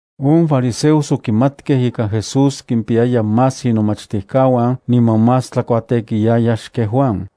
On fariseos okimatkej ika Jesús kimpiyaya más inomachtijkauan niman más tlakuatekiyaya xken Juan.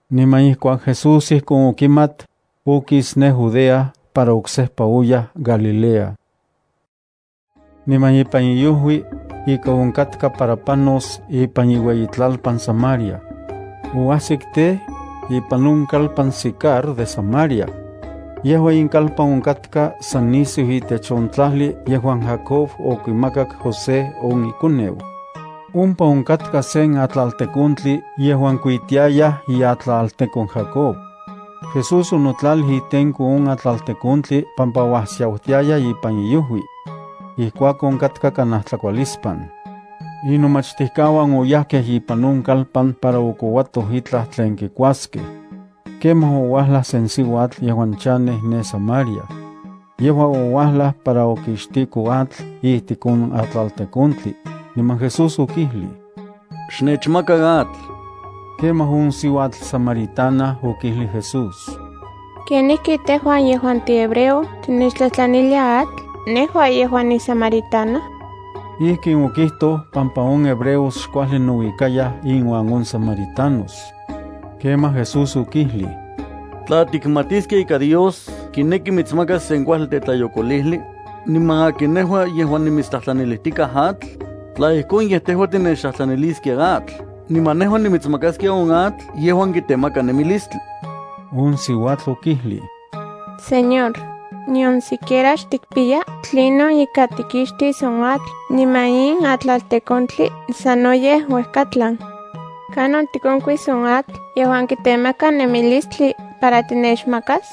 Niman ijkuak Jesús ijkon okimat, okis ne Judea para oksejpa oyaj Galilea. Niman ipan iojui, ika onkatka para panos ipan iueyitlalpan Samaria. Oajsik tej, ipan on kalpan Sicar de Samaria. Yejua in kalpan onkatka san nisiu itech on tlajli yejuan Jacob okimakak José on ikoneu. Ompa onkatka sen atlaltekontli yejuan kuitiayaj iatlaltekon Jacob. Jesús onotlalij itenko on atlaltekontli pampa uajsiautiaya ipan iojui. Ijkuakon katka kanaj tlakualispan. Inomachtijkauan oyajkej ipan on kalpan para okouatoj itlaj tlen kikuaskej. Kemaj ouajlaj sen siuatl yejuan chanej ne Samaria. Yejua ouajlaj para okixtiko atl ijtik on atlaltekontli, niman Jesús okijlij: —Xnechmaka atl. Kemaj on siuatl samaritana okijlij Jesús: —¿Kenijki tejua yejuan tihebreo tinechtlajtlanilia atl nejua yejuan nisamaritana? Ijkin okijtoj pampa on hebreos xkuajli nouikayaj inuan on samaritanos. Kemaj Jesús okijlij: —Tla tikmatiskia ika Dios kineki mitsmakas sen kuajli tetlayokolijli, niman akin nejua yejuan nimitstlajtlanilijtikaj atl, tla ijkon, yej tejua tinechtlajtlaniliskia atl niman nejua nimitsmakaskia on atl yejuan kitemaka nemilistli. On siuatl okijlij: —Señor, nion siquiera xtikpiya tlinon ika tikixtis on atl niman in atlaltekontli sanoyej uejkatlan. ¿Kanon tikonkuis on atl yejuan kitemaka nemilistli para tinechmakas?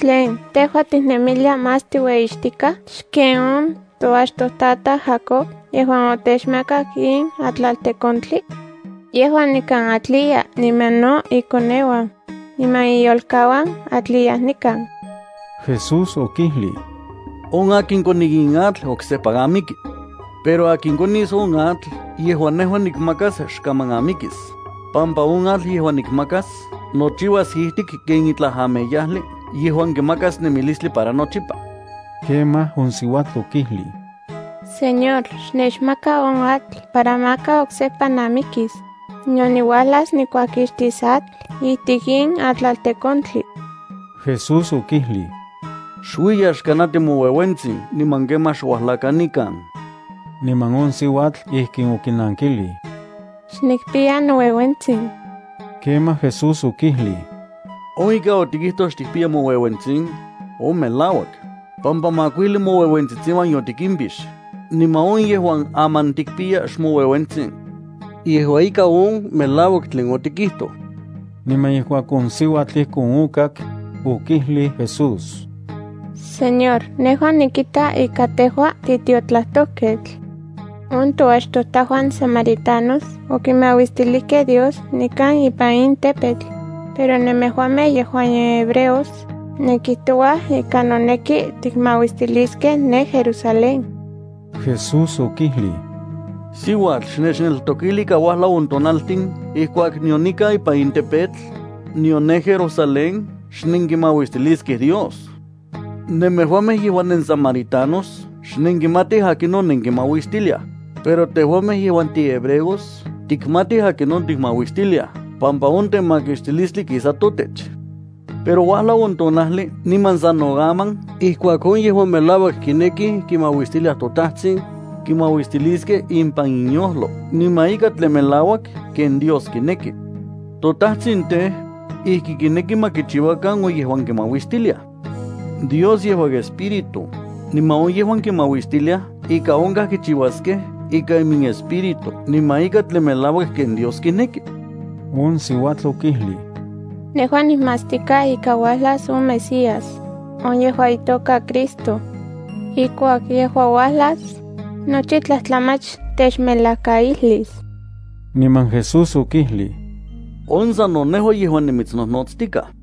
¿Tlen tejua tiknemilia más tiueyixtikaj xken on toachtojtataj Jacob yejuan otechmakak in atlaltekontli? Yejua nikan atliya niman no ikoneuan, niman iyolkauan atliyaj nikan. Jesús okijlij: —On akin koni in atl oksejpa amiki. Pero akin konis on atl yejuan nikmakas xkaman amikis, pampa on atl yejuan nikmakas yejua ijtik ken itlaj ameyajli yejuan kimakas nemilistli para nochipa. Kemaj on siuatl okijlij: —Señor, xnechmaka on atl para maka oksejpa namikis, nion niuajlas nikuajkixtis atl ijtik in atlaltekontli. Jesús okijlij: —Xuiya xkanati moueuentsin niman kemaj xuajlakan nikan. Niman on siuatl ijkin okinankilij: —Xnikpiya noueuentsin. Kemaj Jesús okijlij: —On ika otikijtoj xtikpiya moueuentsin, on melauak, pampa makuijli moueuentsitsiuan yotikimpix, niman on yejuan aman tikpiya xmoueuentsin. Yejua ika on melauak tlen otikijtoj. Niman ijkuak on siuatl ijkon okak, okijlij Jesús: —Señor, nejua nikita ika tejua titiotlajtojketl. On toachtojtajuan samaritanos okimauistilijkej Dios nikan ipan in tepetl, pero nemejuamej yejuan nenhebreos nenkijtouaj ika noneki tikmauistiliskej ne Jerusalén. Jesús okijlij: —Siuatl, xnechneltokili ika uajlau on tonaltin ijkuak nion nikan ipan in tepetl, nion ne Jerusalén xnenkimauistiliskej Dios. Nemejuamej yejuan nensamaritanos xnenkimatij akinon nenkimauistiliaj, pero tejuamej yejuan tihebreos tikmatij akinon tikmauistiliaj pampa on temakixtilistli kisa totech. Pero uajlau on tonajli niman sano aman ijkuak on yejuan melauak kinekij kimauistiliaj toTajtsin, kimauistiliskej impan inyojlo niman ika tlen melauak ken Dios kineki. ToTajtsin tej, ijki kineki ma kichiuakan on yejuan kimauistiliaj. Dios yejua Espíritu, niman on yejuan kimauistiliaj ika onkaj kichiuaskej ikan iminespíritu niman ika tlen melauak ken Dios kineki. On siuatl okijlij: —Nejua nikmatstikaj ika uajlas on Mesías, on yejuan itoka Cristo. Ijkuak yejua uajlas, nochi tlajtlamach techmelajkaijlis. Niman Jesús okijlij: —Sano nejua yejuan nimitsnojnotstikaj.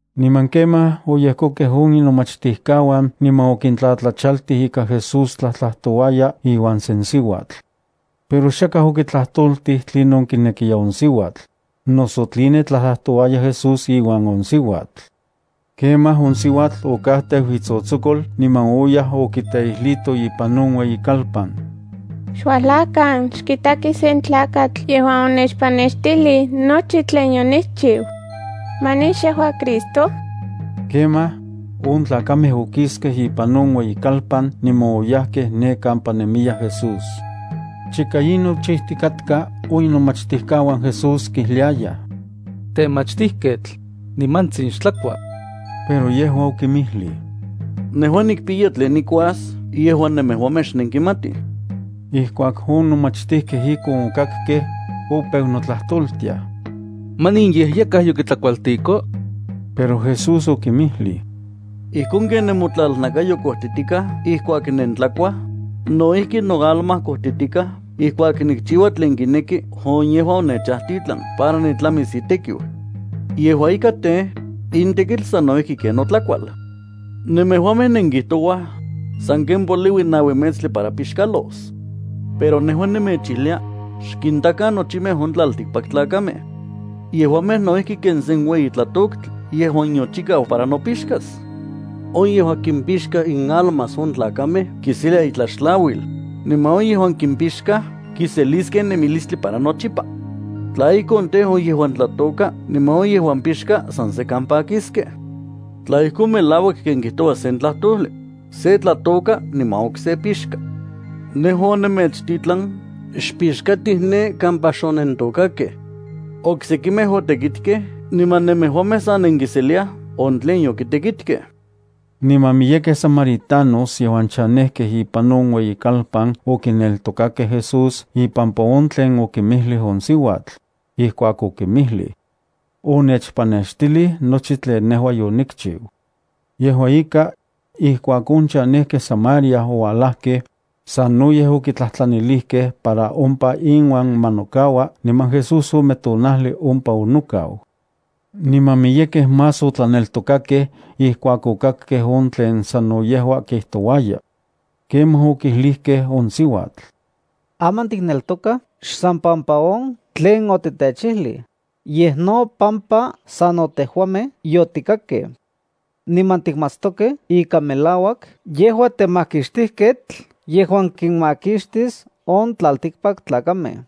Niman kemaj oyejkokej on inomachtijkauan niman okintlatlachaltij ika Jesús tlajtlajtouaya iuan sen siuatl. Pero xakaj okitlajtoltij tlinon kinekiya on siuatl, noso tline tlajtlajtouaya Jesús iuan on siuatl. Kemaj on siuatl okajteu itsotsokol niman oyaj okiteijlito ipan on ueyikalpan: —Xuajlakan, xkitakij sen tlakatl yejuan onechpanextijlij nochi tlen yonikchiu. ¿Manin xyejua Cristo? Kemaj, on tlakamej okiskej ipan on ueyikalpan niman oyajkej ne kampa nemiya Jesús. Chika in nochijtikatka, on inomachtijkauan Jesús kijliayaj: —Temachtijketl, nimantsin xtlakua. Pero yejua okinmijlij: —Nejua nikpiya tlen nikuas yejuan nemejuamej xnenkimatij. Ijkuak on nomachtijkej ijkon okakkej, opeu notlajtoltiaj: —¿Manin yej yakaj yokitlakualtiko? Pero Jesús okinmijlij: —Ijkon ken nemotlalnakayo kojtitikaj ijkuak nentlakuaj, no ijki noalma kojtitikaj ijkuak nikchiua tlen kineki on yejuan onechajtitlan para nitlamis itekiu. Yejua ika tej, in tekitl sano ijki ken notlakual. Nemejuamej nenkijtouaj: “Sanken poliui naui metstli para pixkalos.” Pero nejua nemechijlia: Xkintakan nochimej on tlaltikpaktlakamej. Yejuamej no ijki ken se ueyi tlatoktli yejuan yochikau para nopixkas. On yejuan kimpixka inalmas on tlakamej kiselia itlaxtlauil, niman on yejuan kimpixkaj kiseliskej nemilistli para nochipa. Tla ijkon tej, on yejuan tlatôka niman on yejuan pixka san sekan pakiskej. Tla ijkon, melauak ken kijtoua sen tlajtojli: “Se tlatôka niman okse pixka.” Nejua onemechtitlan xpixkatij ne kampa xonentokakej. Oksekimej otekitkej niman nemejuamej sa nenkiseliaj on tlen yokitekitkej. Niman miyekej samaritanos yejuan chanejkej ipan on ueyikalpan okineltokakej Jesús ipampa on tlen okinmijlij on siuatl ijkuak okinmijli: “Onechpanextilij nochi tlen nejua yonikchiu.” Yejua ika, ijkuak on chanejkej Samaria oualajkej, sanoyej okitlajtlanilijkej para ompa inuan ma nokaua niman Jesús ome tonajli ompa onokau. Niman miyekej más otlaneltokakej ijkuak okakkej on tlen sano yejua kijtouaya. Kemaj okijlijkej on siuatl: —Aman tikneltokaj xsan pampa on tlen otitechijlij, yej no pampa sano tejuamej yotikakkej. Niman tikmatstokej ika melauak yejua temakixtijketl yejuan kinmakixtis on tlaltikpaktlakamej.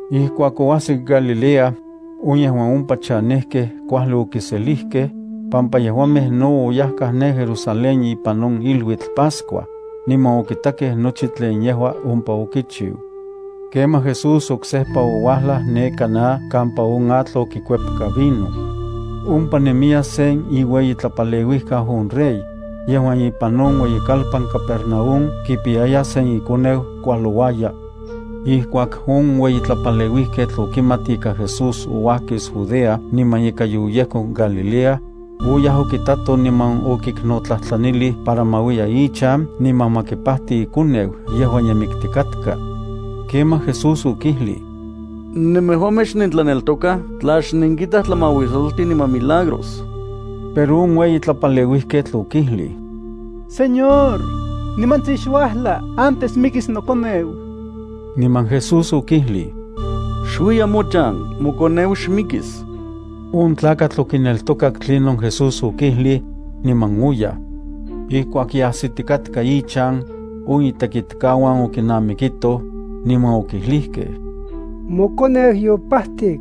Ijkuak oajsik Galilea, on yejuan ompa chanejkej kuajli okiselijkej, pampa yejuamej no oyajkaj ne Jerusalén ipan on iluitl Pascua, niman okitakej nochi tlen yejua ompa okichiu. Kemaj Jesús oksejpa ouajlaj ne Caná kampa on atl okikuepka vino. Ompa nemiya sen iueyitlapaleuijkau on rey, yejuan ipan on ueyikalpan Capernaúm kipiyaya sen ikoneu kualouaya. Ijkuak on ueyitlapaleuijketl okimat ika Jesús ouajkis Judea niman ika yoyejkok Galilea, oyaj okitato niman okiknotlajtlanilij para ma uiya ichan niman ma kipajti ikoneu yejuan ye miktikatka. Kemaj Jesús okijlij: —Nemejuamej xnentlaneltokaj tla xnenkitaj tlamauisoltin niman milagros. Pero on ueyitlapaleuijketl okijlij: —Señor, nimantsin xuajla antes mikis nokoneu. Niman Jesús okijlij: —Xuiya mochan. Mokoneu xmikis. On tlakatl okineltokak tlinon Jesús okijlij, niman oyaj. Ijkuak ye ajsitikatka ichan on itekitkauan okinamikitoj, niman okijlijkej: —Mokoneu yopajtik.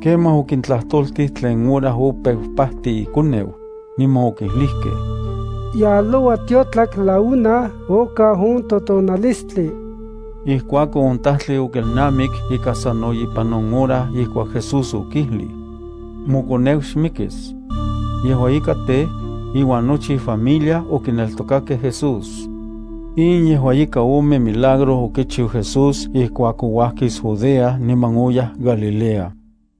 Kemaj okintlajtoltij tlen hora opeu pajti ikoneu, niman okijlijkej: —Yaloua tiotlak la una okau on totonalistli. Ijkuakon on tajtli okelnamik ika sano ipan on hora ijkuak Jesús okijlij: “Mokoneu xmikis.” Yejua ika tej, iuan nochi ifamilia okineltokakej Jesús. In yejua ika ome milagro okichiu Jesús ijkuak ouajkis Judea niman oyaj Galilea.